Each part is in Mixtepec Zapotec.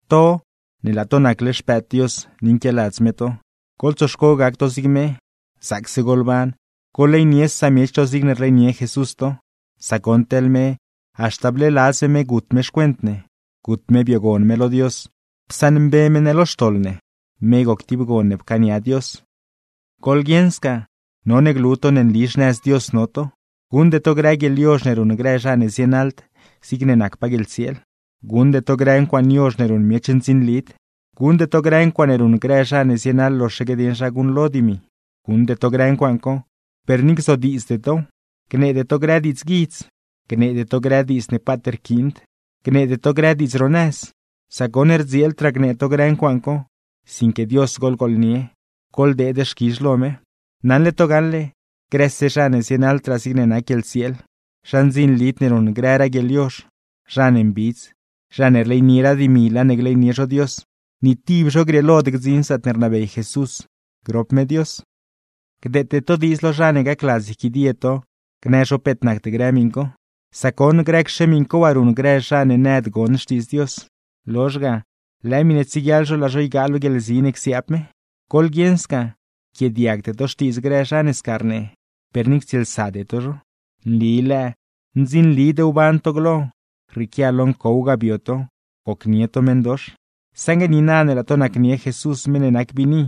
To ne laa to nacle xpëëd Dios ni nquialadz me to, goḻtsoxco gac to zig me. Zaacse goḻban, goḻleynie samiech to zigne rleynie Jesús to, sac goṉ teḻ me, haxta bleeladz me me gut me xcuent ne, gut me biogon me lo Dios psaṉmbe me ne lo xtoḻ ne, me goc tib gon ne pcaania Dios. Goḻguieṉ sca, none glu to ne nli xnëz Dios no to; guṉde to grë guieḻyozh ne ruṉ grë zha ne zienaḻd zigne nacpaa guieḻtsieel, guṉde to grë ncuaaṉe yozh ne ruṉ miech ndzinlid, guṉde to grë ncuaaṉe ruṉ grë zha ne zienaḻ loxaque dieṉ zha guṉlo dimi. Guṉde to grë ncuaaṉ co, per ni gzodiidzde tow. Gneede to grë diidzguidz, gneede to grë diidz ne paat rquiind, gneede to grë diidz ro nëz; sac goṉ rdzieeldraa gnee to grë ncuaaṉ co; sinque Dios goḻgooḻnie, goḻdeed xquizh lo me. Naṉle to gaṉle, grëse: zha ne zienaḻdraa zigne nac guieḻtsieel, zha ndzinlid ne ruṉ grëraa guieḻyozh, zha ne mbidz (zha ne rleynieraa dimi, laa ne gleynie zho Dios); ni tib zho grieelod gdziṉ zaatne rnabey Jesús grop me Dios. Gdeete to diidz lo zha ne gacladz yquidie to gnë zho peet nacd grë miṉ co, sac goṉ, grëcxe miṉ co waa ruṉ grë zha ne nëd gon xtiidz Dios, lozh ga, lëë miṉe tsieguiaḻ zho laa zho ygaa lo guieḻzi ne csiaab me. Goḻguieṉ sca, yquiaadiagde to xtiidz grë zha ne sca rnee, per ni ctsieelsade to zho. Nli, ¿lëë?, ndzinlid wban to glo, rrieequia lo ncow ga bio to, gocnie to meṉdox; saṉgue niina ne laa to nacnie Jesús meṉ ne nac biini,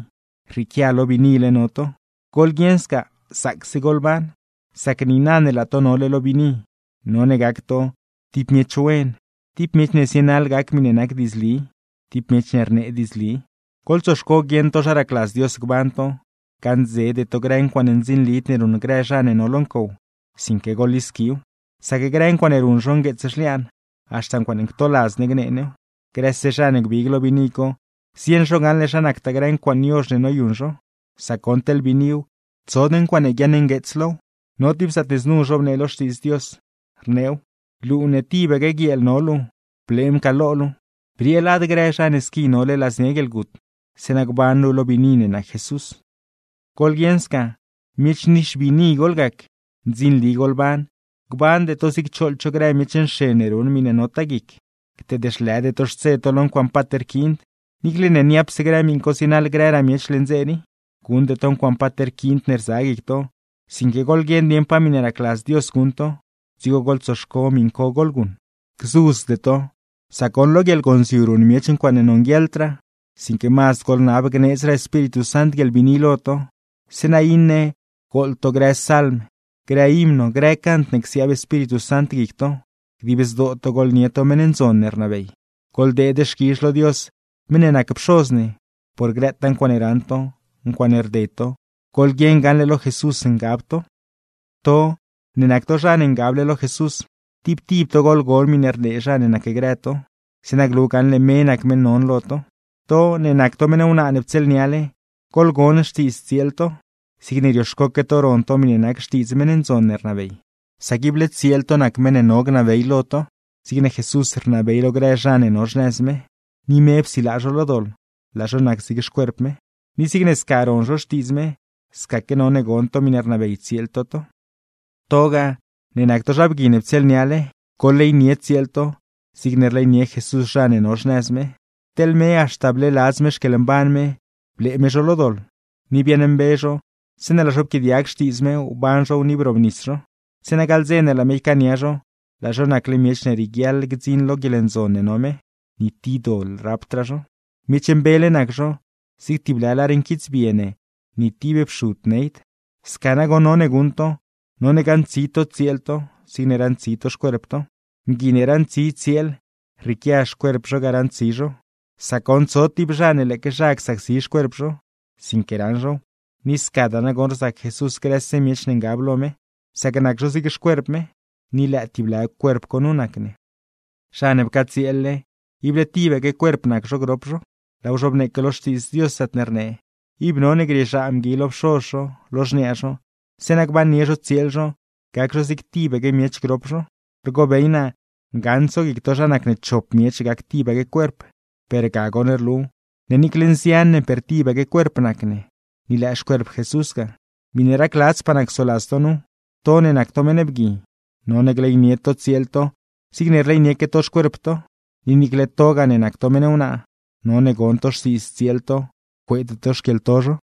rrieequia lo biinile no to. Goḻguieṉa sca, zaacse goḻban, sac niina ne laa to nole lo biini, none gac to: tib miech wen, tib miech ne zienaḻ gac miṉe nac diidzli, tib miech ne rnee diidzli. Goḻtsoxco guieṉ to zha racladz Dios gban to. Gaṉdzede to grë ncuaaṉe ndzinlid ne ruṉ grë zha ne no lo ncow, sinque goḻlisquiw; sac grë ncuaaṉe ruṉ zho ngueets zhliaan, haxta ncuaaṉe ctoladz ne gnee new. Grëse zha ne gbig lo biini co, zieṉ zho gaṉle zha nactaa grë ncuaaṉe yozh ne noyuṉ zho; sac goṉ teḻne biiniw, tsod ncuaaṉe guiaṉngueets low. No tib zaatne znu zhobnee lo Xtiidz Dios, rneew: Luu ne tibaque guieel no luu, blee mcaaḻ lo luu; briee lad grë zha ne squi nole ladznia guieḻgut, zeeṉa gban luu lo biini ne nac Jesús. Goḻguieṉ sca: Miech nixbiini goḻgac, ndzinli goḻban; gbande to zig choḻ cho grë miech nxen ne ruṉ miṉe notaa guic. Cteed zhlëde to xtse to lo ncuaaṉe paat rquiind, niicle ne niapse grë miṉ co zienaḻ grëraa miech leṉ dze rii. Guṉde to ncuaaṉe paat rquiind ne rza guic to, sinque goḻguieṉ dieṉ pa miṉpaa racladz Dios guṉ to, dzigo goḻtsoxco miṉ co goḻguṉ. Gzudzde to, sac goṉ lo guieḻgonziu ruṉ miech ncuaaṉe nonguieḻdraa; sinque mazd goḻnab gneedzraa Espíritu Sant guieḻbiini lo to, zeeṉa iṉe: gooḻ to grë salm, grë himno, grë cant ne csiaab Espíritu Sant guic to; dib zdoo to goḻgooḻnie meṉ ndzon ne rnabey. Goḻdeed xquizh lo Dios meṉ ne nac Pxoz ne, por grëtaa ncuaaṉe raṉ to, ncuaaṉe rded to; goḻguieṉ gaṉle lo Jesús ngab to. To ne nac to zha ne ngable lo Jesús, tib tib to goḻgon miṉe rnee zha ne nacgrë to, zeeṉa glu gaṉle me nac meṉ non lo to. To ne nac to meṉ wnaa ne ptsieelniale, goḻgon xtiidz tsieel to, zigne rioxcoque to ron to miṉe nac xtiidz meṉ ndzon ne rnabey. Sac ible tsieel to nac meṉ ne no gnabey lo to, zigne Jesús rnabey lo grë zha ne no xnëz me (ni me psilaa zho lo doḻ, laa zho nac zig xcuerp me). Ni zigne sca ron zho xtiidz me, scaque none gon to miṉe rnabey tsieel to to. Togaa ne nac to zha bgui ne ptsieelniale, goḻleynie tsieel to, zigne rleynie Jesús zha ne no xnëz me. Teḻ me haxta bleeladz me xquieḻmban me, blee me zho lo doḻ, ni biaaṉmbe zho zeeṉe laa zho pquiaadiag xtiidz me, wban zhow ni brobnis zho; zeeṉa gaḻ dze ne laa me ycaania zho, laa zho nacle miech ne rieguiaḻ gdziṉ lo guieḻndzon ne no me, ni tib doḻ rapdraa zho, miech mbele nac zho, zig tib lë lar nquitsbie ne ni tib pxud neyd. Sca nagoṉ none guṉ mgui, none gaṉtsi zho tsieel zho zigne raṉtsi zho xcuerp zho. Mgui ne raṉtsi tsieel, rrieequia xcuerp zho ga raṉtsi zho; sac goṉ, tsod tib zha ne lëëque zha csacsi xcuerp zho, sinque raṉ zhow. Ni scadaa nagoṉ rzac Jesús grëse miech ne ngab lo me, sac nac zho zig xcuerp me. Ni lëë tib lë cuerp co nu nac ne. Zha ne pcatsieel-le, ible tibaque cuerp nac zho grop zho, laaw zhobneeque lo Xtiidz Dios zaatne rnee: “Ib none grieezhaa mgui lo pxoz zho, lo xniaa zho, zeeṉa gbannie zho tsieel zho gac zho zig tibaque miech grop zho.” Rgobey naa ngaṉ tsoguic to zha nacne chop miech gac tibaque cuerp; per ga goṉ rlu ne niicle nzian ne per tibaque cuerp nac ne, ni lëë xcuerp Jesús ga. Miṉe racladzpaa naa csoladz to nu: to ne nac to meṉ bgui, none gleynie to tsieel to zigne rleynieque to xcuerp to; ni niicle togaa ne nac to meṉ wnaa, none gon to xtiidz tsieel to, cueede to xquieḻto zho.